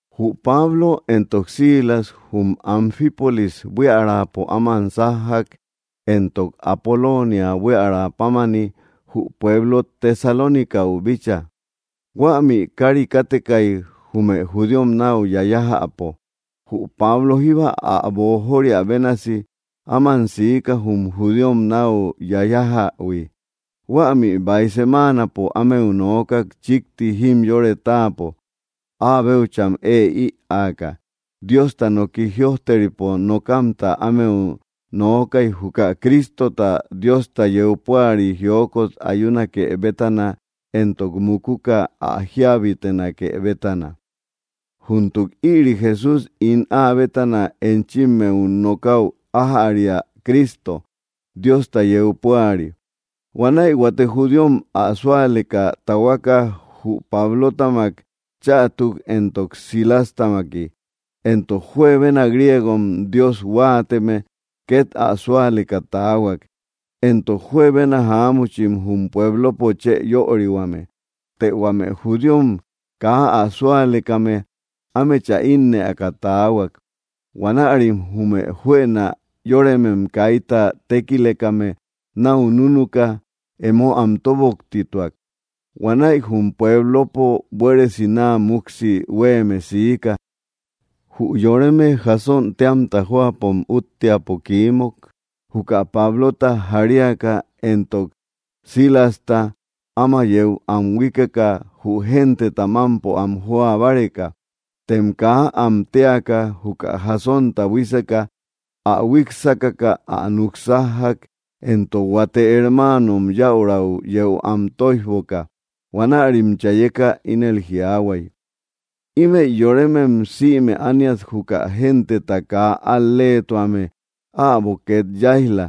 Jü Pablo éntok Silas jum Anfípolis buiärapo áman sájjak éntok Apolóniä buiärapámani, jü pueblo Tesalónicäu bícha. Huämi kari kátekai jume judíom nau yayajäpo. Jü Pablo jíba ä boojóriä bénasi áman siika jum judíom nau yayájähui. Huämi baij semáanapo ámeu noókak chikti jimyore táapo, áa béucham ée ïaaka. Diosta noki jïojteripo nokamta ámeu nookai juka Crístota, Diosta yeu púari, jiókot ayúnake bétana éntok mukuka ä jíabitenake bétana: —Júntuk ïri Jesús ín áa bétana enchimmeu nokäu ájäria Cristo, Diosta yeu púari. Huanäi huate judíom ä súaleka tahuaka jü Pablótamak chätuk éntok Silástamaki. Éntok juebena griégom Dios huáateme ket ä súaleka taahuak, éntok juebena jaámuchim jum puéblopo chë yörihuame. Të huame judíom kaa ä súalekame ámechä ínnëaka taahuak. Huanärim jume juëna yóremem kaita tékilekame nau núnuka, emo am tóboktituak. Huanäi jum puéblopo buéresi naa muksi huéeme siika. Jü yoreme Jasón téamta jóapom útteapo kiímuk juka Pablota jaríaka éntok Silasta, áma yéu am huíkeka jü genteta mampo am joa báreka. Tem kaa am téaka juka Jasonta buíseka ä huíksakaka ä nuksájjak, éntok huate hermáanom, yäurau yéu am tóijboka. Huanärim chayeka ínel jiaahuay: —Ímëi yorémem sïme ániat juka genteta kaa al‑léetuame äbo ket yáij‑la.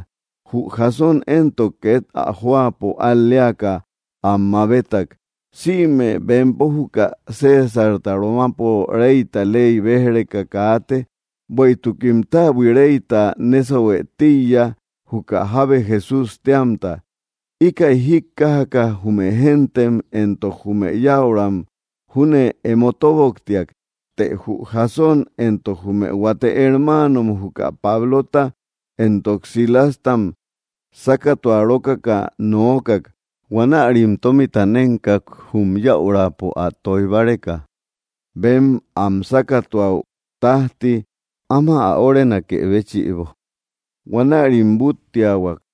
Jü Jasón entok, ket ä jóapo al‑léaka am mabétak. Sïme bempo juka Césarta romapo reyta ley béj‑reka kaate, bueïtukim täbui reyta nésauhuë tíiya, juka jábe Jesús téamta. Íkäi jíkkajaka jume géntem éntok jume yäuram júne emo tóboktiak. Të jü Jasón éntok jume huate hermáanom juka Pablota éntok Silástam sákatuarókaka noókak. Huanärim tómita nénkak jum yäurapo ä tóij báreka bem am sákatuäu tajti áma ä órenakë béchïbo. Huanärim búttiahuak.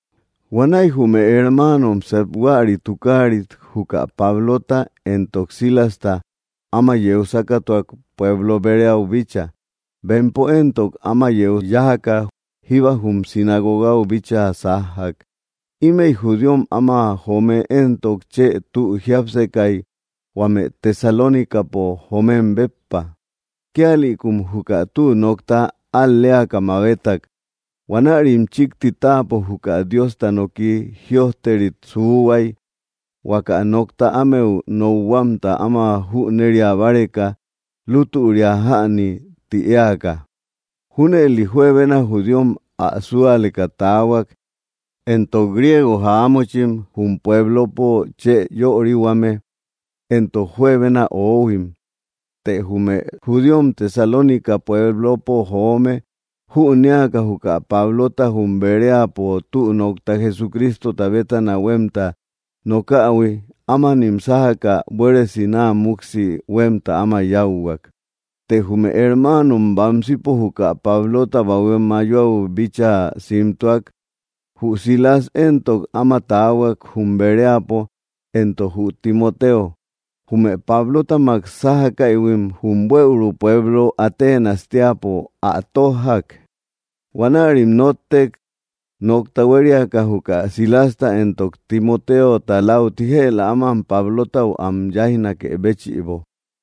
Huanäi jume hermáanom seep huäri tukáarit juka Pablota éntok Silasta áma yeu sákatuak pueblo Beréäu bícha. Bempo éntok, áman yájaka jíba jum sinagogau bíchaa sájjak. Ímëi judíom áma joome éntok, chë tü jiápsekai huame Tesalónicapo joomem béppa. Kíalïkum juka tü nokta al‑léaka mabétak. Huanärim chikti táapo juka Diosta noki jïojterit suuhuai huaka nokta ámeu nokhuamta áma jünéria báreka lútüria jäni ti éaka. Júnëli juebena judíom ä súaleka taahuak, éntok griégo jaámuchim jum puéblopo chë yörihuame éntok juebena oóhuim. Të jume judíom Tesalónica pueblopo joome jünéaka juka Pablota jum Beréapo tü nokta Jesucrístota bétana huemta nokähui, ámanim sájaka buéresi naa muksi huemta áma yáuhuak. Të jume hermáanom bamsipo juka Pablota bahué mayoau bíchaa simtúak. Jü Silas éntok, áma taahuak jum Beréapo, éntok jü Timoteo. Jume Pablótamak sájakaïhuim jum buëuru pueblo Aténas teäpo ä tójjak. Huanärim nóttek nokta huériaka juka Silasta éntok Timotéota lauti jëla áman Pablotau am yáijnakë béchïbo.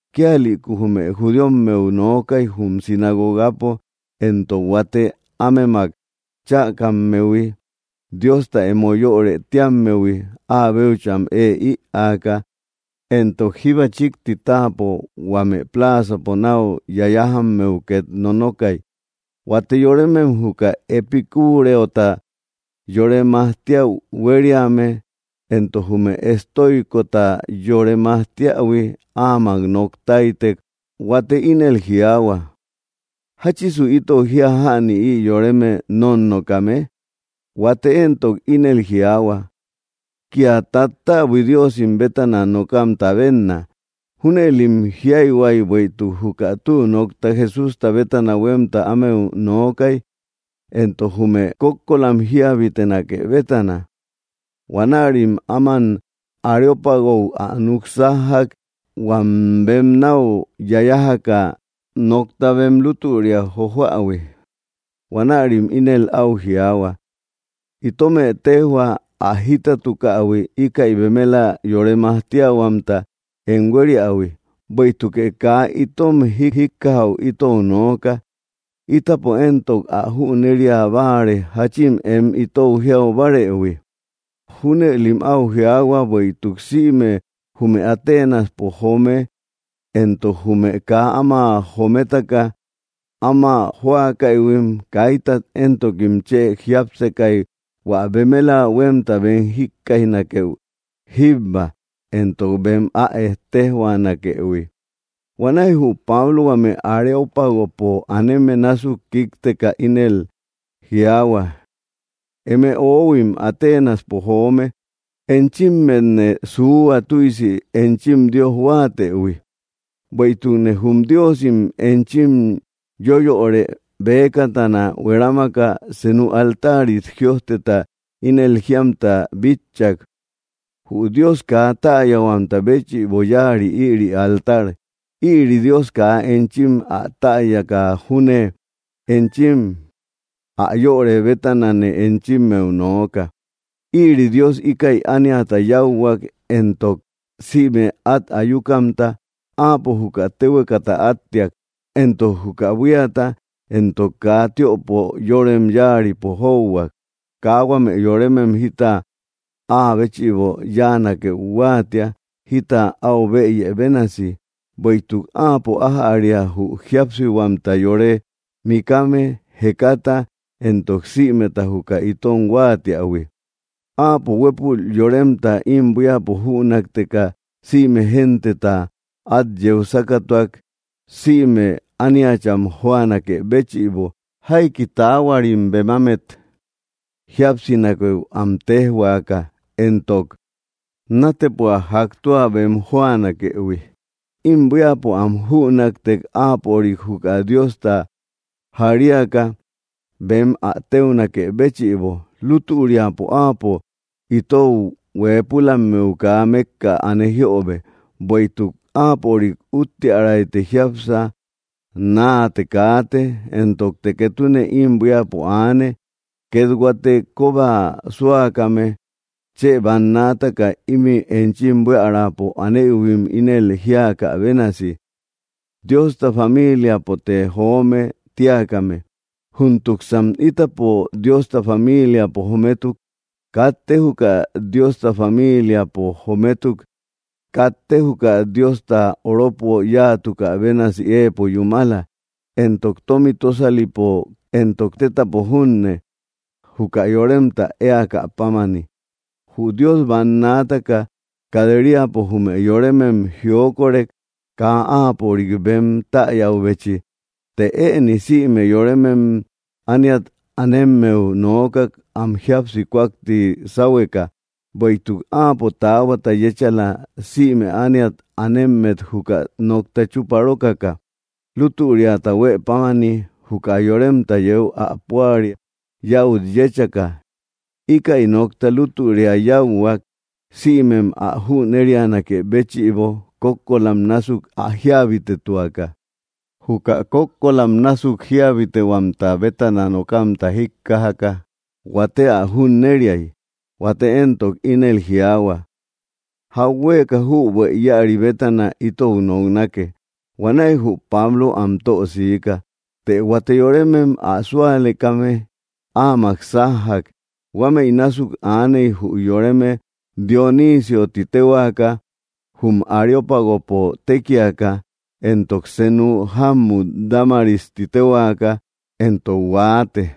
Kíalïku jume judíommeu nookai jum sinagogapo éntok huate ámemak chäkammehui, Diosta emo yörë tíammehui, áa béucham ée ïaaka. Éntok jíba chikti táapo huame plázapo nau yayájammeu ket nonokai. Huate yorémem juka epicúreota yore majtíäu huériame. Éntok jume estóicosta yore majtíähui, áamak noktáitek. Huate ínel jiaahua: —¿Jáchisu itou jia jäni ï yoreme nónnokame? Huate éntok, ínel jiaahua: —Kia tattäbui diósim bétana nokamta benna. Júnëlim jiaahuay bueïtuk juka tü nokta Jesústa bétana huemta ámeu nookai éntok jume kókkolam jíabitenake bétana. Huanärim áman Areópagö ä nuksájjak, huam bem nau yayájaka nokta bem lútüria jojoähui. Huanärim ínel au jiaahua: —Itómë tejhua ä jítatukähui íkäi bemela yore majtíahuamta em huériähui. Bueïtukë kaa itom jíjikkajäu itou nooka, ítapo éntok, ä jünéria báare jachin em itou jiaubárëhui. Júnëlim au jiáhuak bueïtuk sïme jume Atenaspo joome, éntok jume kaa áma jométaka áma jóakaïhuim, kaítat éntokim chë jiápsekai hua bemela huemta bem jikkaijnakeu jíbba éntok bem ä ettejhuanakëhui. Huanäi jü Pablo huame Areópagopo aneme násuk kíkteka ínel jiaahua: —Eme öhuim Atenaspo joome, enchímmetne suuhua tüisi enchim dios huáatëhui. Bueïtukne jum diósim enchim yóyörë bëkatana huerámaka senu altárit jïojteta ínel jíamta bitchak: “Jü Dios kaa täyahuamta béchïbo yáari ïri altar.” Ïri Dios kaa enchim ä täyaka júne enchim ä yörë bétanane enchimmeu nooka. ’Ïri Dios íkäi ániata yáuhuak éntok sïme at ayúkamta. Áapo juka téhuekata átteak éntok juka buíata, éntok kaa tiöpo yorem yáaripo jóuhuak. Kaa huame yorémem jita áa béchïbo yáanakeu huáatia, jita au bëye bénasi. Bueïtuk áapo ájäria jü jíapsihuamta yore mikame, jekata éntok sïmeta juka itom huáatiähui. ’Áapo huépul yoremta im buíapo jünakteka sïme genteta at yeu sákatuak, sïme ániat am jóanakë béchïbo, jaiki taáhuarim bemámet jíapsinakeu am téjhuaaka, éntok nátepoa jak tua bem jóanakëhui. Im buíapo am jünaktek áapörik, juka Diosta, jaríaka bem ä téunakë béchïbo. Lútüriapo áapo itou huëpulammeu kaa mekka ane jiöbe. Bueïtuk áapörik úttiärayte jiápsa, naate kaate, éntokte ketune im buíapo aane. Ket huate koba súakame chë bannaataka imi enchim buíaräpo anéïhuim ínel jíakä bénasi: “Diosta famíliapote joome”, tíakame. Júntuksan ítapo Diosta famíliapo jométuk, katte juka Diosta famíliapo jométuk, katte juka Diosta oropo yáatukä bénasi éepo yúmala, éntok tomi tósalipo, éntok tétapo junne, juka yoremta ä éakäpámani. Jü Dios banaataka kat‑riapo jume yorémem jiókorek kaa áapörik bem täyäubechi, të ëni sïme yorémem ániat anemmeu nooka am jíapsi kúakti sáhueka. Bueïtuk áapo taáhuata yéchala sïme ániat anémmet juka nokta chuparókaka lútüriata huëpámani, juka yoremta yéu ä púari yäut yéchaka. Íkäi nokta lútüria yáuhuak sïmem ä jünérianakë béchïbo kókkolam násuk ä jíabitetuaka. Juka kókkolam násuk jíabitehuamta bétana nokamta jíkkajaka, huate ä junnériai, huate éntok, ínel jiaahua: —Jauhueeka jübuë íäri bétana itou noknake. Huanäi jü Pablo am tösiika. Të huate yorémem ä súalekame áamak sájjak. Huámëi násuk aaney jü yoreme Dionísiö ti téhuaka jum Areópagopo tékiaka, éntok senu jámmut Dámaris ti téhuaka, éntok huaate.